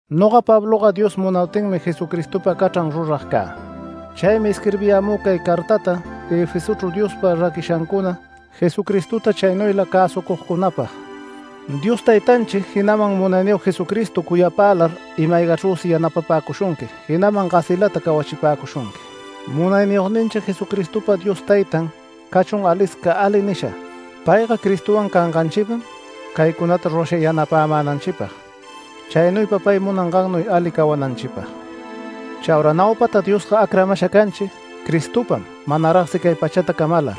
Noga Pabloga Dios munaptinmi Jesucristopa cachran rurag cä. Chaymi isquirbiyämü cay cartata Efesochru Diospa raquishancuna Jesucristota chaynuyla cäsucugcunapag. Dios Taytanchi, jinaman Munayniyog Jesucristo cuyapälar ima-aygachrüsi yanapapäcushunqui, jinaman gasilata cawachipäcushunqui. Munayniyogninchi Jesucristopa Dios Taytan cachun alisca ali nisha. Payga Cristowan canganchipam caycunata rurasha yanapänanchipag, chaynuypa pay munangannuy ali cawananchipag. Chaura naupata Diosga acramasha canchi Cristopam manaragsi cay pachata camalar,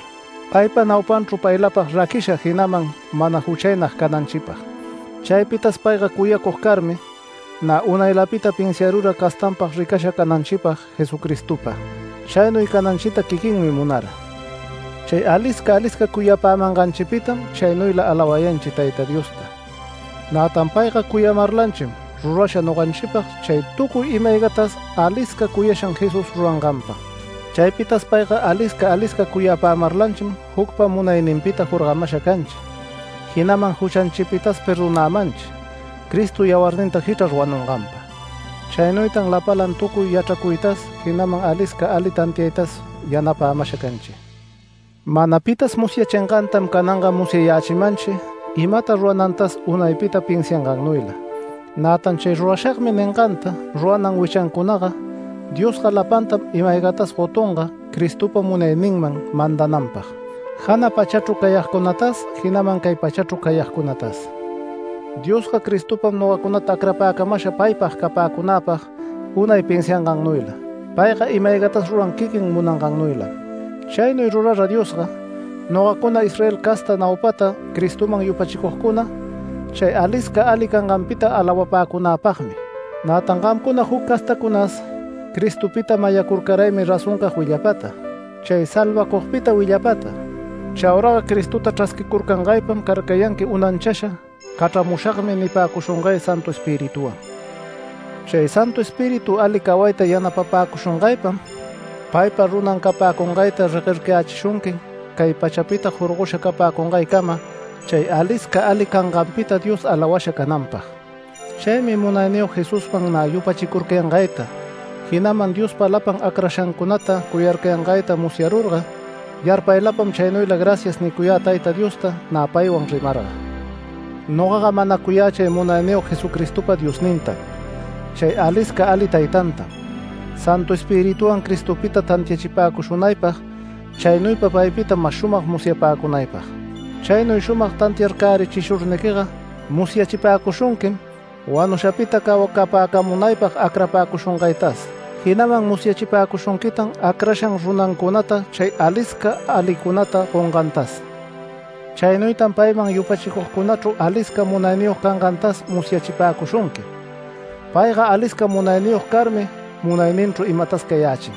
paypa naupanchru paylapag raquisha, jinaman mana juchaynag cananchipag. Chaypitas payga cuyacug carmi nä unaylapita pinsiarura castanpag ricasha cananchipag Jesucristopa. Chaynuy cananchita quiquinmi munara. Chay alisca alisca cuyapämanganchipitam chaynuyla alawayanchi Tayta Diosta, nätan payga cuyamarlanchim rurasha noganchipag chay tucuy ima-aygatas alisca cuyashan Jesús ruranganpa. Chaypitas payga alisca alisca cuyapämarlanchim jucpa munayninpita jorgamasha canchi, jinaman juchanchipitas perdonämanchi Cristo yawarninta jichrar wanunganpa. Chaynuytan lapalan tucuy yachracuytas, jinaman alisca ali tantiaytas yanapämasha canchi. Mana pitas musyachingantam, cananga musyayächimanchi imata ruranantas unaypita pinsiangannuyla. Nätan “Chay rurashagmi” ninganta ruranan wichancunaga, Diosga lapantam ima-aygatas gotunga Cristopa munayninman mandananpag, jana pachacunachru cayagcunatas jinaman cay pachachru cayagcunatas. Diosga Cristopam nogacunata acrapäcamasha paypag capäcunapag unay pinsiangannuyla, payga ima-aygatas ruran quiquin munangannuylam. Chaynuy rurara Diosga, nogacuna Israel casta naupata Cristoman yupachicugcuna, chay alisca ali canganpita alawapäcunapagmi. Nätan gamcuna juc castacunas Cristopita mayacurcaraymi razoncag willapata, chay salvacugpita willapata. Chauraga Cristota chrasquicurcangaypam carcayanqui unanchasha “Cachramushagmi” nipäcushungay Santu Espirituwan. Chay Santu Espíritu ali cawayta yanapapäcushungaypam paypa runan capäcungayta reguercayächishunqui cay pachapita jorgosha capäcungaycama chay alisca ali canganpita Dios alawasha cananpag. Chaymi munayniyog Jesusman nä yupachicurcayangayta, jinaman Diospa lapan acrashancunata cuyarcayangayta musyarurga, yarpaylapam chaynuyla “Gracias” nicuyä Tayta Diosta nä paywan rimarga. Nogaga manacuyä chay Munayniyog Jesucristopa Diosnintam, chay alisca ali Taytantam, Santu Espirituwan Cristopita tantiachipäcushunaypag, chaynuypa paypita mas shumag musyapäcunaypag. Chaynuy shumag tantiarcärichishurniquiga musyachipäcushunquim, wanushapita cawacapäcamunaypag acrapäcushungaytas. Jinaman musyachipäcushunquitan acrashan runancunata chay alisca alicunata gongantas. Chaynuytan payman yupachicugcunachru alisca munayniyog cangantas musyachipäcushunqui. Payga alisca munayniyog carmi munayninchru imatas cayächin.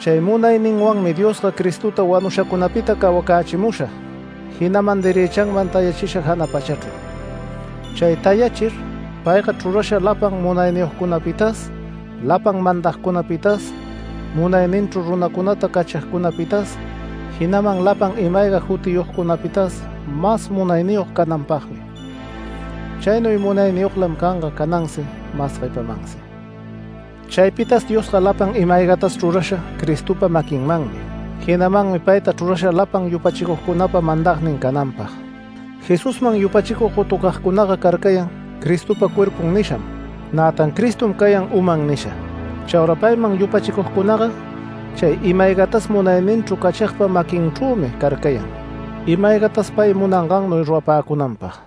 Chay munayninwanmi Diosga, Cristota wanushacunapita cawacächimusha, jinaman derëchanman tayachisha jana pachachru. Chay tayachir payga chrurasha lapan munayniyogcunapitas, lapan mandagcunapitas, munayninchru runacunata cachigcunapitas, jinaman lapan ima-ayga jutiyogcunapitas mas munayniyog cananpagmi. Chaynuy munayniyoglam canga canansi mas guepamansi. Chaypitas Diosga lapan ima-aygatas chrurasha Cristopa maquinmanmi, jinamanmi payta chrurasha lapan yupachicugcunapa mandagnin cananpag. Jesusman yupachicug gotucagcunaga carcayan ‘Cristopa cuerpun’ nisham, nätan Cristom cayan ‘uman’ nisha. Chaura payman yupachicugcunaga chay ima-aygatas munayninchru cachigpa maquinchrümi carcayan, ima-aygatas pay munangannuy rurapäcunanpag.